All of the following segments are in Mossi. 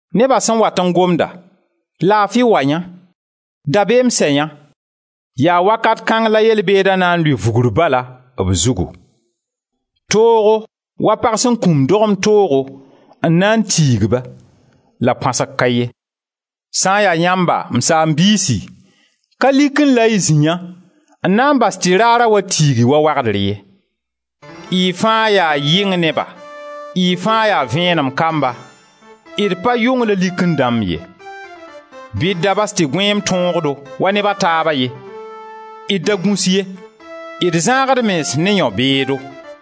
Neba sẽn wat n gomda: Laafi wa yã! Dabeem sɛ yã! Yaa wakat kãng la yel-beeda na n lʋɩ vugr bala b zugu. Toogo wa pag sẽn kũmd dogem toogo, n na n tiig-ba, la põasg ka ye. Sã n ya yãmba, m saam-biisi, ka likẽ la y zĩ yã n na n bas tɩ raara wa tiig-y wa wagdr ye. Y fãa yaa yɩng neba, y fãa yaa vẽenem kamba, d pa yʋng la likẽ dãmb ye. Bɩ d da bas tɩ gõeem tõog-do wa neb a taaba ye, d da gũs ye, d zãag d mens ne yão-beedo.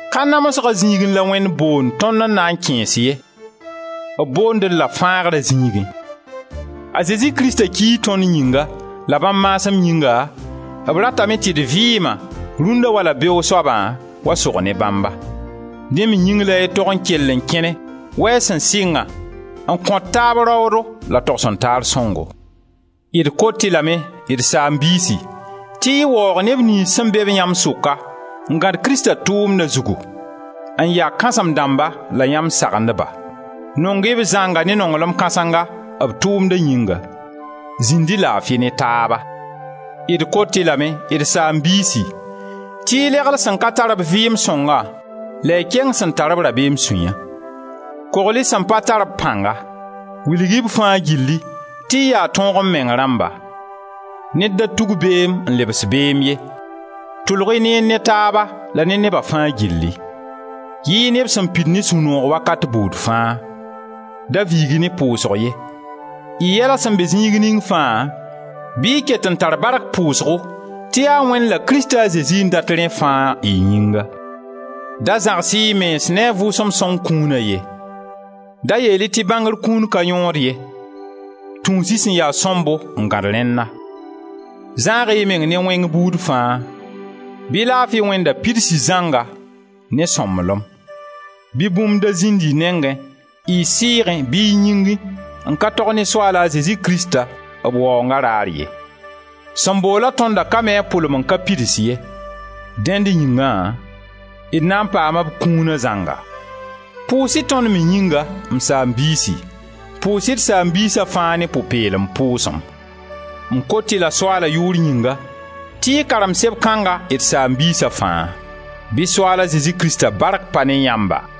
Ka namsga zĩigẽ la Wẽnd boond tõnd n na n kẽes ye, b boond-d-la fãagra zĩigẽ. A Zezi Krista kii tõnd yĩnga, la bãmb maasem yĩnga, b ratame tɩ d vɩɩma, rũnna wala beoog soaba, wa sog ne bãmba. Dẽ me yĩng la y tog n kell n kẽne wa y sẽn sɩngã, n kõt taab raoodo la togs-n-taar sõngo. D kot-y lame, d saam-biisi, tɩ y waoog neb niyns sẽn be-b yãmb sʋka n gãd Krista tʋʋmna zugu, n ya kãsem-dãmba la yãmb sagendba. Nong-y-b zãnga ne nonglem kãsenga, b tʋʋmda yĩnga. Zĩnd-y laafi ne taaba. D kot-y lame, d saam-biisi, tɩ y legl sẽn ka tar-b vɩɩm sõnga la y keng sẽn tar-b rabeem sũya. Kogl-y sẽn pa tar-b pãnga. Wilg-y b fãa gilli tɩ y yaa tõog-m-meng rãmba. Ned da tug beem n lebs beem ye. Tʋlg-y neer ne taaba la ne neba fãa gilli. Yɩɩ neb sẽn pid ne sũ-noog wakat buud fãa. Da viig-y ne pʋʋsg ye. Y yɛla sẽn be zĩig ning fãa bɩ y ket n tar bark pʋʋsgo tɩ yaa Wẽnd la Krista a Zezi n dat rẽ fãa, y yĩnga. Da zãgs-y y mens ne a Vʋʋsem Sõng kũuna ye. Da yeel-y tɩ bãngr kũun ka yõod ye. Tũus-y sẽn ya sõmbo n gãd rẽnna. Zãag-y y meng ne wẽng buud fãa. Bɩ laafi Wẽnda pids-y zãnga ne sõmblem. Bɩ bũmb da zĩnd y nengẽ, y sɩɩgẽ bɩ y yĩngẽ, n ka tog ne Soaal a Zezi Krista, b Waoonga raar ye. Sẽn boola tõndã ka mi a pʋlem n ka pids ye. Dẽnd yĩngã d na n paama b kũuna zãnga. Pʋʋs-y tõnd me yĩnga, m saam-biisi. Pʋʋs-y d saam-biisa fãa ne pʋ-peelem pʋʋsem. M kot-y-la Soaala yʋʋr yĩnga, tɩ y karem seb kãnga d saam-biisa fãa. Bɩ Soaal a Zezi Krista bark pa ne yãmba!